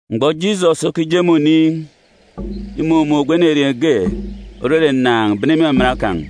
Mgbọ Jisọs okije me oniin̄, imumun̄ ogwu enerieen̄ ge òrere ǹnàan̄ bene me imaman kan̄.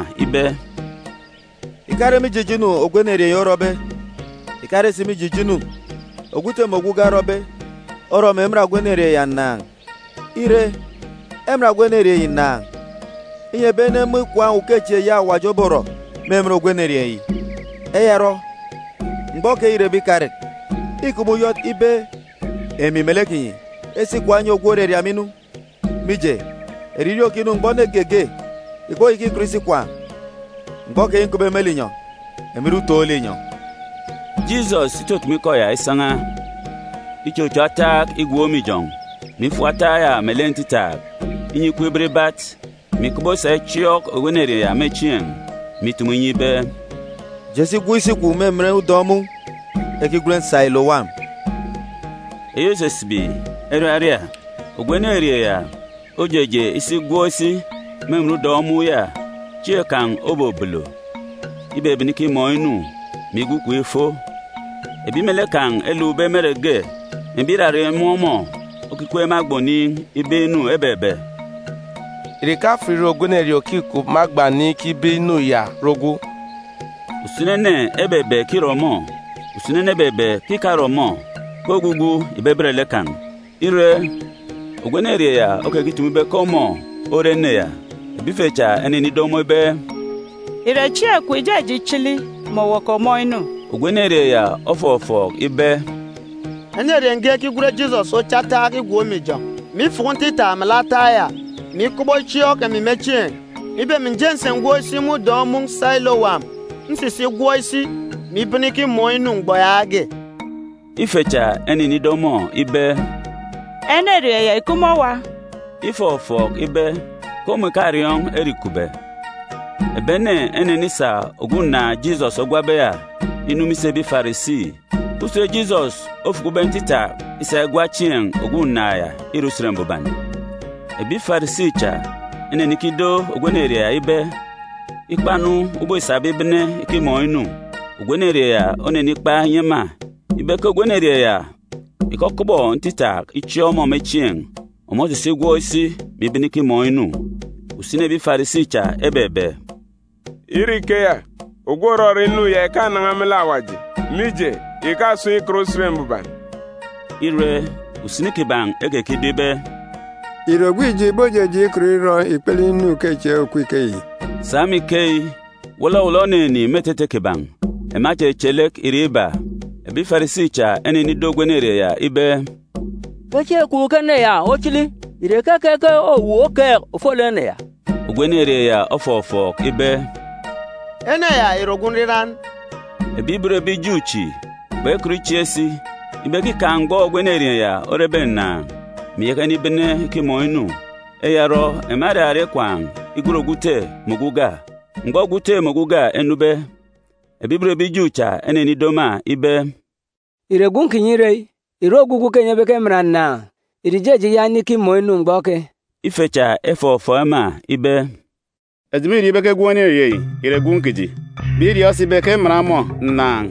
Jisọs ofọfọọk ema ibe, “Ìkare mije ijo inu ogwu enerieen̄ yi orọbe, ìkarere si mije ijo inu ogwu ute mè ogwu uga erọbe, orọ mè eman ogwu enerieen̄ ya ǹnàan̄. Ire, eman ogwu enerieen̄ yi ǹnàan̄, inyi ebi ene emun̄ ikwaan̄ ukechieen̄ eyi Awaji oborọ me emen ogwu enerieen̄ yi. Eya orọ, mgbọ keyi îrebe ikarek, îkup me uyọt ibe emi melek kinyi esi ikwaan̄ enyi ogwu òraria emi inu. Mije, eririeen̄ òkinu mgbọ ene geege ìkpoyaka ikọt isi ikwaan̄. Mgbọ keyi nkupbe me linyọn̄, emi nre utoon̄ linyọn̄.” Jisọs itutumu ikọ ya isan̄a, ichocho ataak igwook me ijọn̄, mè ifuku ataak ya melek ntitaak, inyi ikup ibat ibat, mè ikọbọ isa ichiọọk ogwu enerieen̄ ya me chieen̄, mè itumu inyi ibe, “Je si gwọk isi kwun̄ me emen udọn̄ mun̄ ekigwen Silowam” (eyi òsisibi “Eraria”). Ogwu enerieen̄ ya ojeje isi igwọk isi me emen udọn̄ mun̄ ya. Chieen̄ kan̄ obobolo. Ibebene ikimọọn̄ inu, mè igwu ikom ifo. Ebi melek kan̄ elukbe me ere ge, mè ebi ìrarak imun̄ ọmọ okikweek me agba oniin̄ ibeek inu ebebe, “Ìre ìkafat ìre ogwu enerieen̄ òkikup me agba oniin̄ ikibeek inu ya ore ogwu?” Usini ene ebebe ke îre ọmọ. Usini ene ebebe ke ìkare ọmọ; ke ogwugwu ìbebet lek kan̄. Ire, ogwu enerieen̄ ya okekitumu ibe ke ọmọ ore ene ya. Ebi ife cha enenido ọmọ ibe, “Ìre chieen̄ kwun̄ ìjeje ichili, mè owu òkomọọn̄ inu?” Ogwu enerieen̄ ya ofọfọọk ibe, “Enerieen̄ ge ekigwen Jisọs ocho ataak igwook me ijọn̄, mè ifuku ntitaak melek ataak ya, mè ikọbọ ichiọọk emi me chieen̄, mè ibe emi ǹje ǹsi ǹgwọk isi me udọn̄ mun̄ Silowam. Nsisi igwọk isi, mè ibene ikimọọn̄ inu mgbọ yaage.” Ife cha enenido ọmọ ibe, “Enerieen̄ ya ìkup me owa?” Ifọfọọk ibe ke ọmọ ìkariọọn̄ ere îkupbe. Ebi ene enenisa ogwu ǹnàan̄ Jisọs ogwabe ya inu me isi ebi Farisi. Usen Jisọs ofukube ntitaak isa igwa chieen̄ ogwu ǹnàan̄ ya ìre Usen Mbuban. Ebi Farisi cha enenikido ogwu enerieen̄ ya ibe ikpa-nu ubọk îsabe ibene ikimọọn̄ inu. Ogwu enerieen̄ ya onenikpa inyi ema ibe ke ogwu enerieen̄ ya ìkọkọbọ ntitaak ichiọọk ọmọ me chieen̄, ọmọ osisi igwọk isi, mè ibene ikimọọn̄ inu. Usini ebi Farisi cha ebebe, “Ire ikeya, ogwu òrọrọ inu ya ìkanan̄a me lek Awaji, mije, ìkasun̄ ikan Usen Mbuban.” Ire, usini kiban̄ ekekido ibe, “Ìre ogwu ijo ìbojeje ikọt irọ ikpele inu ukechieen̄ òkup ikeyi?” Sa me ikeyi, wọlọwọlọ oninin̄ me etete kiban̄. Ema echeche lek irek iba. Ebi Farisi cha enenido ogwu enerieen̄ ya ibe, “Ke chieen̄ kwun̄ ke ene ya ochili. Ìre keke ke owu okeek ofolek ene ya?” Ogwu enerieen̄ ya ofọfọọk ibe, “Ene ya ìre ogwu nriran.” Ebi ibot ebi Ju chi kpekọt ichieek si ibe ke îkaan̄ mgbọ ogwu enerieen̄ ya orebe ǹnàan̄, mè iyaka inibene ikimọọn̄ inu. Eya orọ, ema eraria ikwaan̄ igwen ogwu ute mè ogwu uga. Mgbọ ogwu ute mè ogwu uga enube, ebi ibot ebi Ju cha enenido ema ibe, “Ìre gwun̄ kinyi ire eyi? Ìre ogwugwu ke enyi ebe ke eman ǹnàan̄? Ìre ìjeje iyaka inikimọọn̄ inu mgbọ keyi?” Ife cha efọfọọk ema ibe, “Eji mîriọọn̄ ibe ke gwun̄ enerieen̄ yi ìre gwun̄ kiji, mè iriọọn̄ si ibe ke eman ọmọ ǹnàan̄.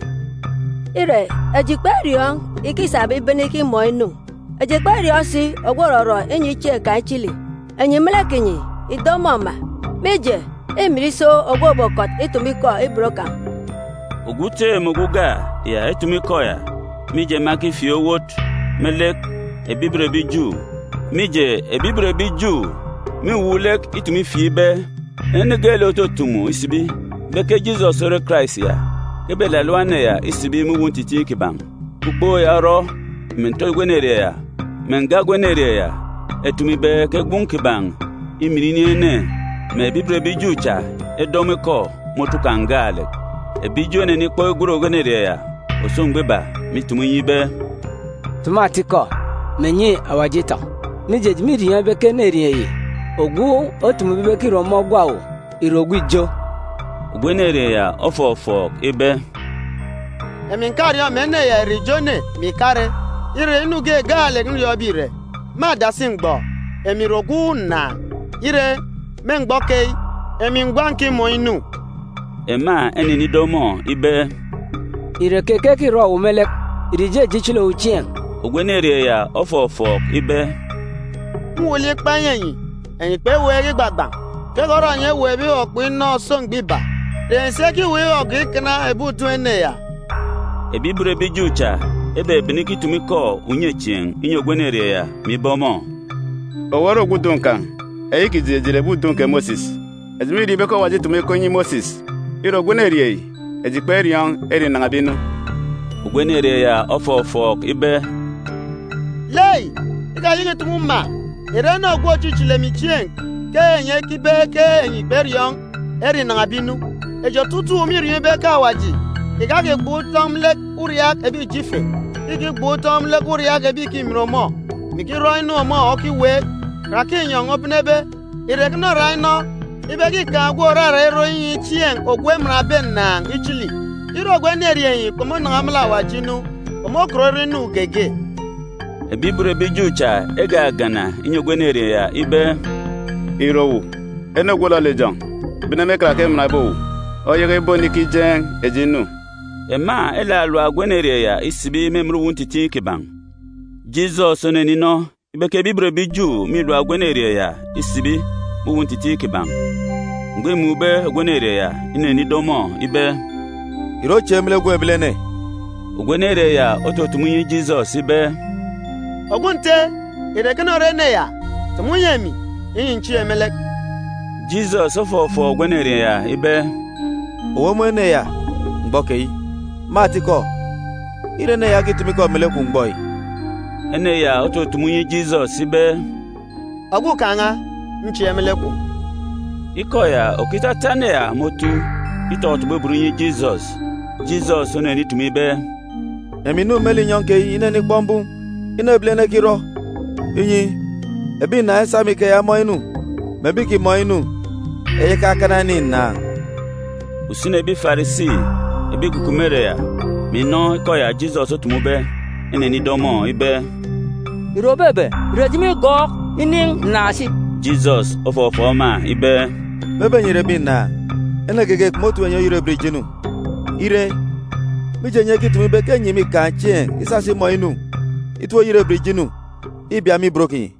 Ire, eji kperiọọn̄ ike îsabe ibene ikimọọn̄ inu. Eji kperiọọn̄ si ogwu òrọrọ inyi chieen̄ kan̄ ichili. Enyi me lek kinyi, ìdo ọmọ ma, mije, îmin iso ogwu òbokọt itumu ikọ ibot kan̄.” Ogwu ute mè ogwu uga ya etumu ikọ ya, mije, ema ekifieek owot me lek ebi ibot ebi Ju. Mije ebi ibot ebi Ju mîwuuk lek itumu ifieek ibe, ene geelek òtutumu isibi ibe ke Jisọs ore Karais ya, ke ebelalap ene ya isibi me uwu ntitiin̄ kiban̄. Ukpook ya orọ mè nte ogwu enerieen̄ ya mè nga ogwu enerieen̄ ya etumu ibe ke gwun̄ kiban̄ îmin inin̄ ene, mè ebi ibot ebi Ju cha edo ọmọ ikọ me otu kan̄ gaalek. Ebi Ju enenikpọk igwen ogwu enerieen̄ ya òso mgbọ iba, mè itumu inyi ibe, “Tumu atikọ, mè nyi Awaji umin. Mije, eji mîriọọn̄ ibe ke enerieen̄ yi, ogwu otumube ibe ke îre ọmọ ogwa owu, ìre ogwu ijo.” Ogwu enerieen̄ ya ofọfọọk ibe, “Emi ǹkariọọn̄ mè ene ya ìre ijo ene, mè ìkare. Ire, inu ge gaalek nriọọn̄be ìre: Me adasi mgbọ, emi ìre ogwu ǹnàan̄. Ire, me mgbọ keyi, emi gwa ǹkimọọn̄ inu!” Ema enenido ọmọ ibe, “Ìre keke ke îrọ owu me lek? Ìre ìjeje ichili owu chieen̄?” Ogwu enerieen̄ ya ofọfọọk ibe, “Mwuuk lek ikpa inyi enyi, enyi kpeweek igbagban̄. Keke orọ enyi eweekbe ikpọkpọk inọ òso mgbọ iba? Ìre enyi si ekiweek igọgọọk ikana ebi udun̄ ene ya?” Ebi ibot ebi Ju cha ebebene ikitumu ikọ unyechieen̄ inyi ogwu enerieen̄ ya, mè ibe ọmọ, “Owu ore ogwu udun̄ kan̄. Eyi kiji, eji ìre ebi udun̄ kè Mosis. Eji mîriọọn̄ ibe ke Awaji îtumu ikọ inyi Mosis. Ire ogwu enerieen̄ yi, eji kperiọọn̄ ere înan̄abe inu.” Ogwu enerieen̄ ya ofọfọọk ibe, “Lei, ikayaka ìtumu ma. Ìre ene ogwu òchichili emi chieen̄ ke enyi ekibe ke enyi kperiọọn̄ ere înan̄abe inu? Eji otutuuk mîriọọn̄ ibe ke Awaji ìkakigban̄ utọn̄ me lek uriaak ebi ijo ife; ke ìkigban̄ utọn̄ me lek uriaak ebi ìkimin ọmọ, mè ikirọ inu ọmọ okiweek. Karake inyọn̄ obenebe, ìre ekene orak inọ ibe ke îkaan̄ ogwu òrarak irọ inyi chieen̄ ogwu emanbe ǹnàan̄ ichili? Ire ogwu enerieen̄ yi kpomonan̄a me lek Awaji inu, kpomokọt irọ inu geege.” Ebi ibot ebi Ju cha egagana inyi ogwu enerieen̄ ya ibe, “Ìre owu, ene ogwu òlọlọ ijọn̄ bene me karake emanbe owu oyaka ibonikijeen̄ eji inu?” Ema elalap ogwu enerieen̄ ya isibi me emen uwu ntitiin̄ kiban̄. Jisọs oneninọ ibe ke ebi ibot ebi Ju mîlap ogwu enerieen̄ ya isibi me uwu ntitiin̄ kiban̄. Mgbọ îmun̄be ogwu enerieen̄ ya, inenido ọmọ ibe, “Ìre ochieek me lek Gwun̄ Ebilene?” Ogwu enerieen̄ ya otutumu inyi Jisọs ibe, “Ogwu Nte, ìre ekene ore ene ya? Tumu nyi emi, inyi ǹchieek me lek.” Jisọs ofọfọọk ogwu enerieen̄ ya ibe, “Owu omun̄ ene ya mgbọ keyi. Me atikọ, îre ene ya okitumu ikọ melek kwun̄ mgbọ yi.” Ene ya otutumu inyi Jisọs ibe, “Ogwukaan̄ n̄a, nchieek me lek kwun̄.” Ikọ ya òkitata ene ya me otu, itọtọbọ ibot inyi Jisọs. Jisọs onenitumu ibe, “Emi ǹnu me linyọn̄ keyi inenikpọk mbum inu ebilene ekirọ, inyi, ebi ǹnàan̄ esa me ikeya emọọn̄ inu, mè ebi ìkimọọn̄ inu eyaka ekana enin̄ ǹnàan̄.” Usini ebi Farisi ebi ìkukup me ere ya, mè inọ ikọ ya Jisọs otumube, enenido ọmọ ibe, “Ìre òbebe? Ìre eji mîgọọk inin̄ ǹnàan̄ si?” Jisọs ofọfọọk ema ibe, “Mebe enyi ìre ebi ǹnàan̄, ene geege kpomotip enyi oyerebet ijo inu. Ire, mije enyi ekitumu ibe ke enyi mîkaan̄ chieen̄ isasa imọọn̄ inu, itip-oyerebet ijo inu îbia me ibot kinyi.”